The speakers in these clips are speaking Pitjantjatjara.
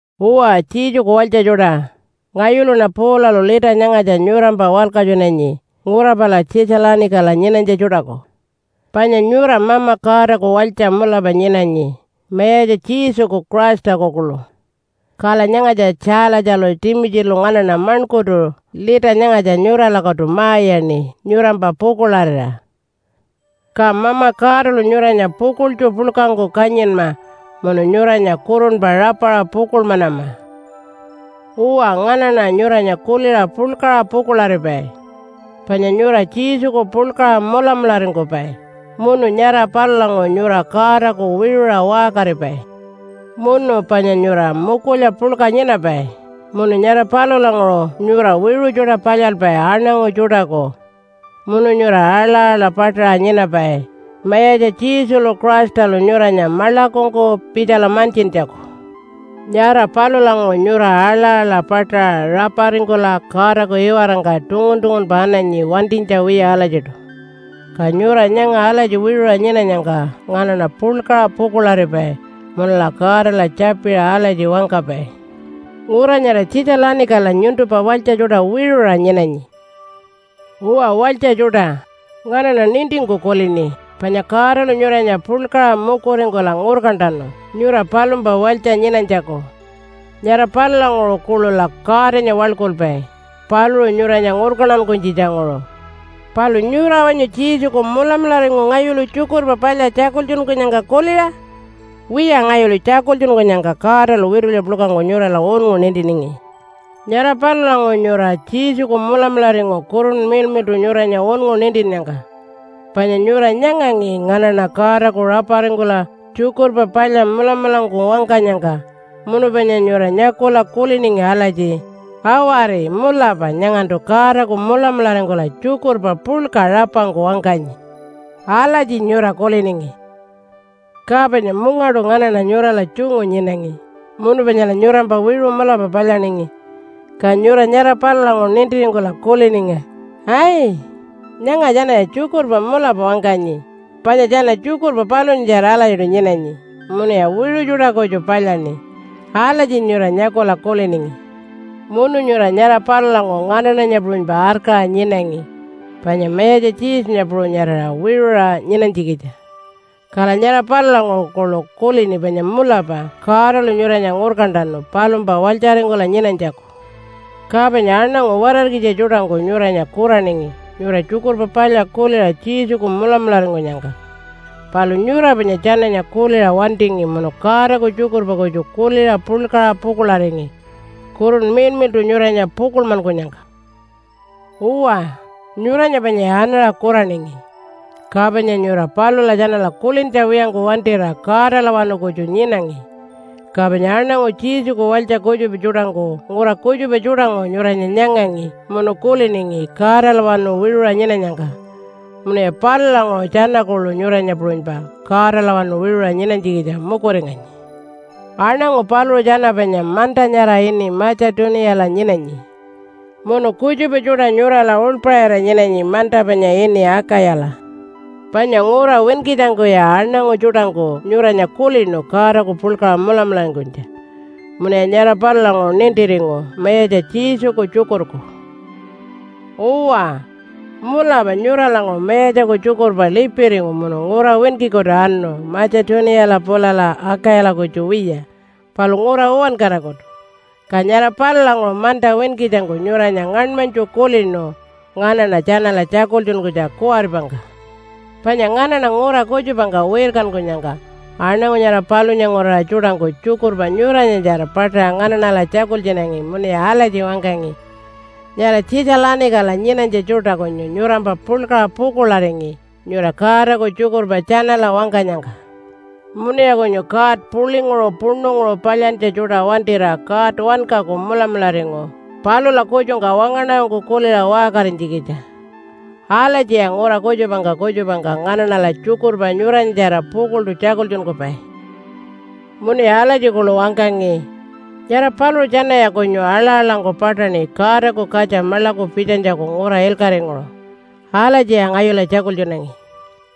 Uwa, Jesuku walytja tjuṯa, ngayuluṉa Paulalu lita nyangatja nyurampa walkatjunanyi ngura pala Tjitja-lanikala nyinanytja tjuṯaku. Panya nyura Mama Godaku walytja mulapa nyinanyi Mayatja Jesuku Christaku kuḻu. Kala nyangatja Tjaalatjalu Timitjilu nganaṉa maṉkurtu lita nyangatja nyuralakutu ma-iyaṉi nyurampa pukuḻarira. Ka Mama Godalu nyuranya pukuḻtju puḻkangku kanyinma munu nyuranya kurunpa rapaṟa pukuḻmanama. Uwa, nganaṉa nyuranya kuliṟa puḻkaṟa pukuḻaripai. Panya nyura Jesuku puḻkaṟa mulamularingkupai munu nyara palulanguṟu nyura Godaku wiṟuṟa waṟkaripai. Munu panya nyura mukulya puḻka nyinapai munu nyara palulanguṟu nyura wiṟu tjuṯa palyalpai aṉangu tjuṯaku. Munu nyura aḻa-aḻa paṯaṟa nyinapai Mayatja Jesulu Christalu nyuranya maḻakungku pitjala mantjintjaku. Nyara palulanguṟu nyura aḻa-aḻa paṯaṟa raparingkula Godaku iwarangka tungun-tungunpa ananyi wantinytja wiya alatjiṯu. Ka nyura nyanga alatji wiṟuṟa nyinanyangka nganaṉa puḻkaṟa pukuḻaripai munula Godala tjapiṟa alatji wangkapai, “Ngura nyara Tjitja-lanikala nyuntumpa walytja tjuṯa wiṟuṟa nyinanyi.” Uwa walytja tjuṯa, nganaṉa nintingku kulini panya Godalu nyuranya puḻkaṟa mukuringkula ngurkantanu nyura palumpa walytja nyinanytjaku. Nyara palulanguṟu kuḻula Godanya waḻkulpai paluṟu nyuranya ngurkantankunytjitjanguṟu. Palu nyura wanyu Jesuku mulamularingu ngayulu Tjukurpa Palya tjakultjunkunyangka kuliṟa? Wiya, ngayulu tjakultjunkunyangka Godalu witulya puḻkangku nyurala unngu nintiningi. Nyara palulanguṟu nyura Jesuku mulamularingu Kurunpa Miḻmiḻṯu nyuranya unngu nintinnyangka. Panya nyura nyangangi nganaṉa Godaku raparingkula Tjukurpa Palya mulamulangku wangkanyangka, munu panya nyura nyakula kuliningi alatji, “Awari, mulapa nyangantu Godaku mulamularingkula tjukurpa puḻka rapangku wangkanyi.” Alatji nyura kuliningi. Ka panya mungaṯu nganaṉa nyurala tjungu nyinangi munu panyala nyurampa wiṟu mulapa palyaningi. Ka nyura nyara palulanguṟu nintiringkula kuliningi, “Ai, nyanga tjanaya tjukurpa mulapa wangkanyi, panya tjana tjukurpa palunyatjara alatjiṯu nyinanyi munuya wiṟu tjuṯa kutju palyaṉi.” Alatji nyura nyakula kuliningi. Munu nyura nyara palulanguṟu nganaṉanya puṟunypa arkaṟa nyinangi panya Mayatja Jesunya puṟunyarira wiṟuṟa nyinanytjikitja. Kala nyara palulanguṟu kuḻu kulini panya mulapa Godalu nyuranya ngurkantanu palumpa walytjaringkula nyinanytjaku. Ka panya aṉangu watarkitja tjuṯangku nyuranya kuraningi nyura Tjukurpa Palya kuliṟa Jesuku mulamularingkunyangka. Palu nyura panya tjananya kuliṟa wantingi munu Godaku tjukurpa kutju kuliṟa puḻkaṟa pukuḻaringi, Kurunpa Miḻmiḻṯu nyuranya pukuḻmankunyangka. Uwa, nyuranya panyaya anaṟa kuraningi, ka panya nyura palula tjanala kulintja wiyangku wantira Godalawanu kutju nyinangi. Ka panya aṉangu Jesuku walytja kutjupa tjuṯangku ngura kutjupa tjuṯanguṟu nyuranya nyangangi munu kuliningi Godalawanu wiṟuṟa nyinanyangka, munuya palulanguṟu tjana kuḻu nyuranya puṟunypa Godalawanu wiṟuṟa nyinanytjikitja mukuringanyi. Aṉangu paluṟu tjana panya manta nyara ini Matja-tuniyala nyinanyi, munu kutjupa tjuṯa nyurala uḻpaṟira nyinanyi manta panya ini Akayala. Panya ngura winkitjangkuya aṉangu tjuṯangku nyuranya kulinu Godaku puḻkaṟa mulamularingkunytja, munuya nyara palulanguṟu nintiringu Mayatja Jesuku tjukurku. Uwa, mulapa nyuralanguṟu Mayatjaku tjukurpa lipiringu munu ngura winkikutu anu Matja-tuniyala pulala Akayala kutju wiya palu ngura uwankarakutu. Ka nyara palulanguṟu manta winkitjangku nyuranya ngaṉmanytju kulinu nganaṉa tjanala tjakultjunkunytja kuwaripangka. Panya nganaṉa ngura kutjupangka wirkankunyangka aṉangu nyara palunya nguraṟa tjuṯangku tjukurpa nyuranyatjara paṯaṟa nganaṉala tjakultjunangi munuya alatji wangkangi, “Nyara Tjitja-lanikala nyinanytja tjuṯa kunyu nyurampa puḻkaṟa pukuḻaringi nyura Godaku tjukurpa tjanala wangkanyangka. Munuya kunyu god puḻinguṟu puṉunguṟu palyantja tjuṯa wantira God wankaku mulamularingu palula kutjungka wangaṉarangku kuliṟa waṟkarinytjikitja.” Alatjiya ngura kutjupangka kutjupangka nganaṉala tjukurpa nyuranyatjara pukuḻṯu tjakultjunkupai. Munuya alatji kuḻu wangkangi, “Nyara paluṟu tjanaya kunyu aḻa-aḻangku paṯaṉi Godaku katja maḻaku pitjanytjaku ngura ilkaṟinguṟu.” Alatjiya ngayula tjakultjunangi.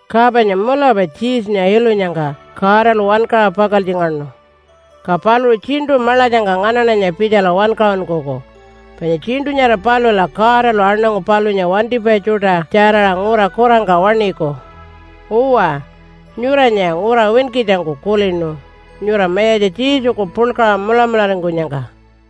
Ka panya mulapa Jesunya ilunyangka Godalu wankaṟa pakaltjingaṉu. Ka paluṟu tjiṉṯu maḻatjangka nganaṉanya pitjala wankaṟunkuku, panya tjiṉṯu nyara palula Godalu aṉangu palunya wantipai tjuṯa tjaraṟa ngura kurangka waṉiku. Uwa, nyuranyaya ngura winkitjangku kulinu nyura Mayatja Jesuku puḻkaṟa mulamularingkunyangka.